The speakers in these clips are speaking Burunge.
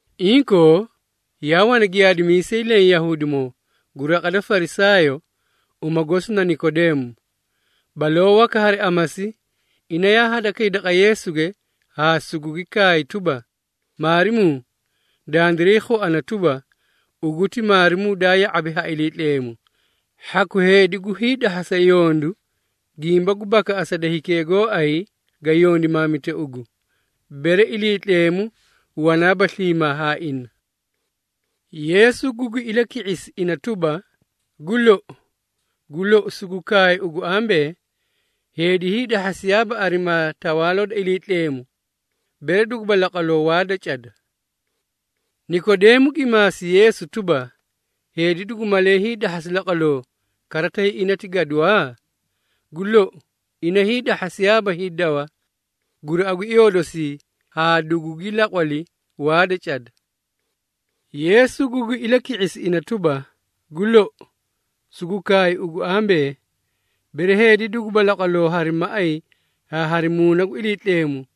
Inkoo, yaa wana giyaadimiisay leẽ Yahuudimoo gu raqa da Farisaayoo, uma gosi na Nikodeemo. Baloo waka hari amasi, ina yaa hadakay daqa Yeesuge haa sugugi kaay tuba, “Maarimuu, dandiray khuana tuba, ugu ti maarimuu daa ya⁄abi ha Iliitleemu. Hhaku heedi gu hiidahhasa yondu gimba gu bakaꞌasa da hikee gooay ga yondimaamite ugu, bere Iliitleemu wanaaba sliimaa haa ina.” Yeesu gugi ilaki⁄isi ina tuba, “Gu lou, gu lou, sugu kaay ugu ambee, heedi hiidahhasiyaaba arimaa Tawaaloo da Iliitleemu, bere duguba laqwaloo waa da cada.” Nikodeemo gi maasi Yeesu tuba, “Heedi dugu malee hiidahhasi laqwaloo kara tay ina ti gaduwaa? Gu lou, ina hiidahhasiyaaba hiidawa guraꞌa gu iyoo dosii haa dugugi laqwali waa da cada!” Yeesu gugi ilaki⁄isi ina tuba, “Gu lou, sugu kaay ugu ambee, bere heedi duguba laqwaloo hari maꞌay haa hari Muuna gu Iliitleemu,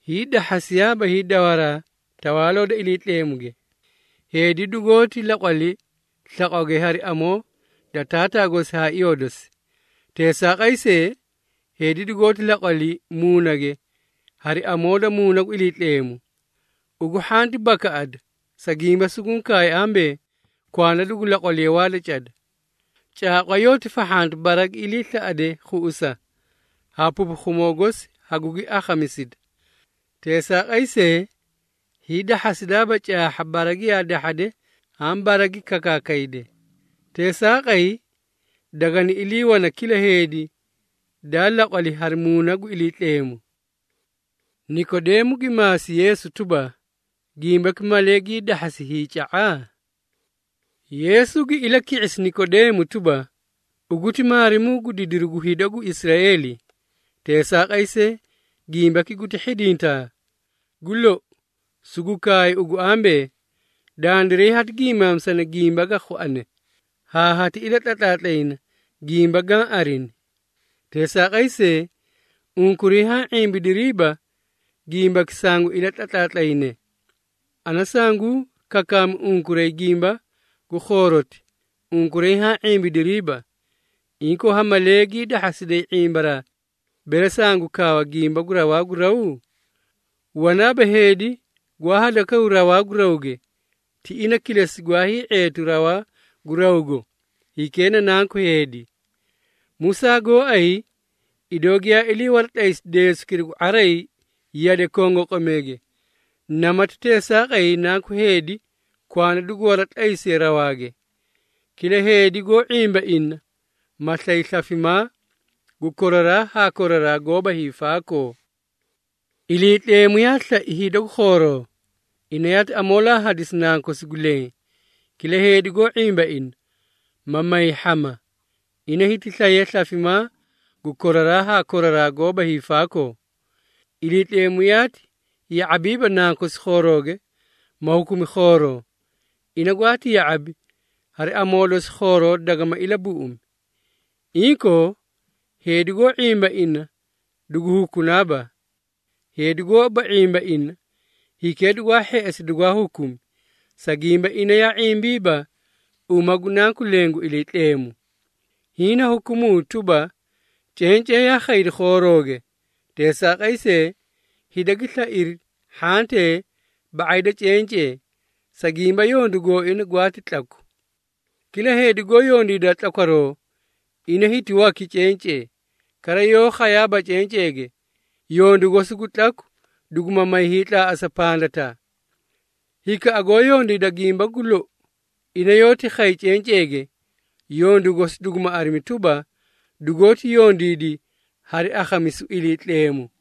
hiidahhasiyaaba hiidawaraa Tawaaloo da Iliitleemuge. Heedi dugoóti laqwali slaqwage hari amoo da taataa gosi haa iyoo dosi. Teesaaqay see, heedi dugoóti laqwali muunage hari amoo da Muuna gu Iliitleemu. Ugu hhanti bakaꞌada, sa gimba suguũ kaay ambee, ‘Kwanda dugu laqwaliye waa da cada.’ Caaqwa yoóti fahhanta bara gi iliislaꞌade khuꞌusa, haa pupukhumoo gosi hagugi akhamisida. Teesaaqay see, hiidahhasidaaba caahha bara giyaa dahhade haã bara gi kakaakayde. Teesaaqay dagani ilii wana kila heedi daa laqwali hari Muuna gu Iliitleemu.” Nikodeemo gi maasi Yeesu tuba, “Gimbaki malee gii dahhasi hiica⁄a?” Yeesu gi ilaki⁄isi Nikodeemo tuba, “Ugu ti maarimuu gu didiru gu hida gu Israeeli. Teesaaqay see, gimbaki guti hhidintaa? Gu lou, sugu kaay ugu ambee, dandiray hati giimaamisana gimba ga khuane, haa hati ilatlatlaatlayna gimba gaã arini. Teesaaqay see, unkuray haã ⁄imbidiriiba gimbaki sangu ilatlatlaatlayne. Ana sanguũ kakaami unkuray gimba gu khooroti, unkuray haã ⁄imbidiriiba. Inkoo, ha malee gii dahhasiday ⁄imbaraa, bere sangu kaawa gimba gu rawaa gu raw? Wanaaba heedi gwaa hadakaw rawaa gu rawge, ti ina kilesi gwaa hii⁄eetu rawaa gu rawgo, hikee na Nanku Heedi. Musaa gooay idoo giyaa ilii waratlaysi deesukira gu ⁄aray yade kongoqomeege, namati teesaaqay Nanku Heedi kwanda dugu waratlaysiye rawaage, kila heedi goó ⁄imba ina, ma slay slafimaa gu koraraa haa koraraa goóba hiifaakoo. Iliitleemu yaa slai hida gu khooroo, ina yaati amoolaa hadisi Nankosi gu leẽ, kila heedi goó ⁄imba ina, ma may hhama, ina hiti slaye slafimaa gu koraraa haa koraraa goóba hiifaakoo. Iliitleemu yaati ya⁄abiiba Nankosi khoorooge, ma hukumi khooroo. Ina gwaati ya⁄abi, hari amoo dosi khooroo dagama ilabuꞌumi. Inkoo, heedi goó ⁄imba ina dugu hukunaaba. Heedi goóba ⁄imba ina, hikee dugwaa hheꞌesi dugwaa hukumi, sa gimba ina yaa ⁄imbiiba uma gu Nanku leẽ gu Iliitleemu. Hiĩ na hukumuu tuba, cencee yaa khaydi khoorooge, teesaaqay see, hida gi slairi hhantee ba⁄ay da cencee, sa gimba yondu gooina gwaati tlaku. Kila heedi goó yondiida tlakwaroo, ina hiti waki cencee, kara yaa khayaaba cenceege, yondu gosi gu tlaku duguma may hiitlaaꞌasa pandataa. Hikaꞌa goó yondiida gimba gu lou, ina yoóti khay cenceege, yondu gosi duguma arimi tuba, dugoóti yondiidi hari akhamisu Iliitleemu.”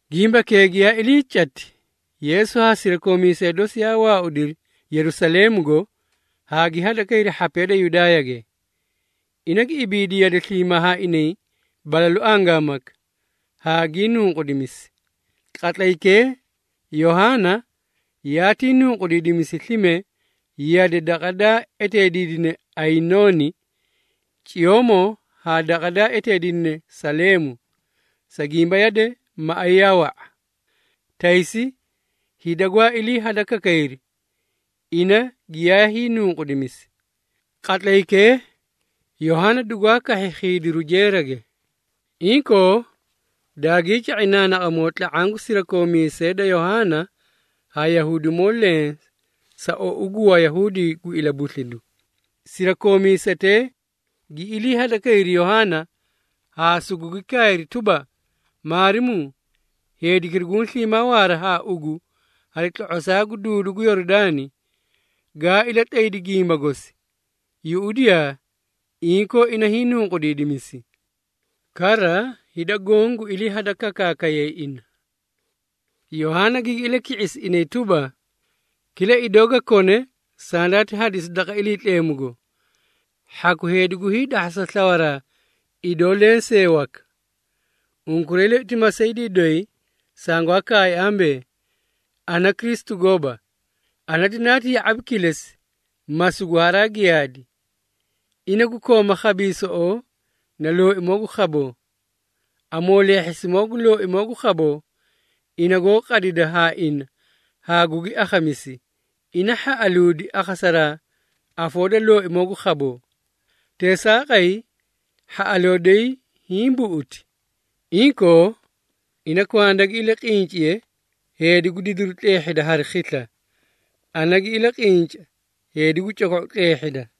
Gimbakee giyaa ilii cati, Yeesu haa sirakoomiisee dosi yaa waaudiri Yerusaleemugo haa gi hadakayri hhapee da Yudaayage. Ina gi ibiidi yade sliimaa haa inay balalu angaamaka, haa gii nunqudimisi. Qatlaykee, Yohaana yaatii nunqudiidimisi slime yade daqa daa eteediidine Ayinooni, ciyoomoo haa daqa daa eteediidine Saleemu, sa gimba yade maꞌay yaa wa⁄a. Taysi hida gwaa ilii hadakakayri, ina giyaa hiinunqudimisi. Qatlaykee, Yohaana dugwaa kahhi khiidiru jeerage. Inkoo, daagii ca⁄i naanaqamoo tla⁄aã gu sirakoomiisee da Yohaana haa Yahuudimoo leẽ sa ou gu Wayahuudi gu ilabuslidu. Sirakoomiisetee gi iliihadakayri Yohaana, haa sugugi kaayri tuba, “Maarimuu, heedikira guũ sliimaa waara haa ugu hari tlo⁄osaa gu duudu gu Yoridaani, gaa ilatlaydi gimba gosi, yuꞌudiyaa, inkoo ina hiinunqudiidimisi. Kara hida goõ gu ilii hadakakaakayay ina.” Yohaana gigi ilaki⁄isi inay tuba, “Kila idoo ga kone sandaati hadisi daqa Iliitleemugo. Hhaku heedi gu hiidahhasa slawaraa idoo lensee waka. Unkuray loi ti masaydii doyi sangwaa kaay ambee, ‘Ana Kristu gooba. Ana dinaati ya⁄abi kilesi ma sugu haraa giyaadi.’ Ina gu koomaa khabiisoꞌoo na looimoo gu khaboo. Amooleehhisimoo gu looimoo gu khaboo, ina goó qadida haa ina haa gugi akhamisi, ina hhaꞌaluudi akhasaraa afoo da looimoo gu khaboo. Teesaaqay, hhaꞌaloo doyi hiĩ buꞌuti. Inkoo, ina kwanda gi ilaqinciye heedi gu didiru tleehhida hari khisla, ana gi ilaqinca heedi gu coko⁄u tleehhida.”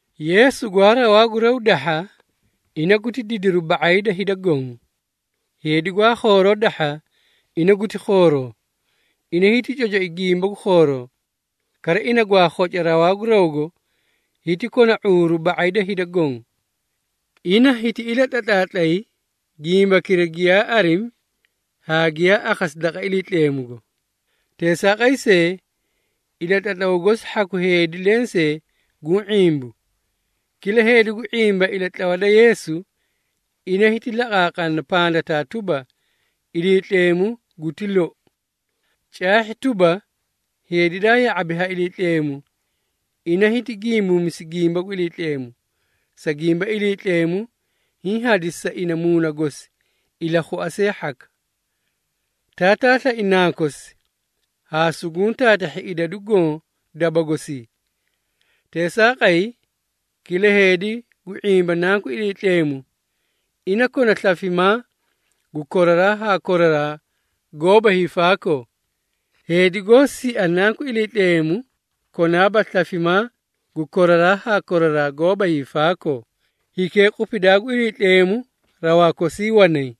Yeesu gwaa rawaa gu raw dahha, ina guti didiru ba⁄ay da hida goõ. Heedi gwaa khooroo dahha ina guti khooroo, ina hiti cocoi gimba gu khooroo. Kara, ina gwaa khoca rawaa gu rawgo, hiti kona ⁄uuru ba⁄ay da hida goõ. Ina hiti ilatlatlaatlay gimbakira giyaa arimi haa giyaa akhasi daqa Iliitleemugo. Teesaaqay see, ilatlatlaw gosi hhaku heedi lensee guũ ⁄imbu. Kila heedi gu ⁄imba ilatlawa da Yeesu, ina hiti laqaaqana pandataa tuba, Iliitleemu guti lou. Caahhi tuba, heedi daa ya⁄abi ha Iliitleemu, ina hiti gimbuumisi gimba gu Iliitleemu, sa gimba Iliitleemu hiĩ hadisi sa ina Muuna gosi ilakhua see hhaka. Taataa slai Nankosi, haa suguũ taatahhi idadu goõ daba gosii. Teesaaqay, kila heedi gu ⁄imba Nanku Iliitleemu, ina kona slafimaa gu koraraa haa koraraa goóba hiifaakoo. Heedi goó sia Nanku Iliitleemu konaaba slafimaa gu koraraa haa koraraa goóba hiifaakoo, hikee qupidaa gu Iliitleemu rawaa kosii wanay.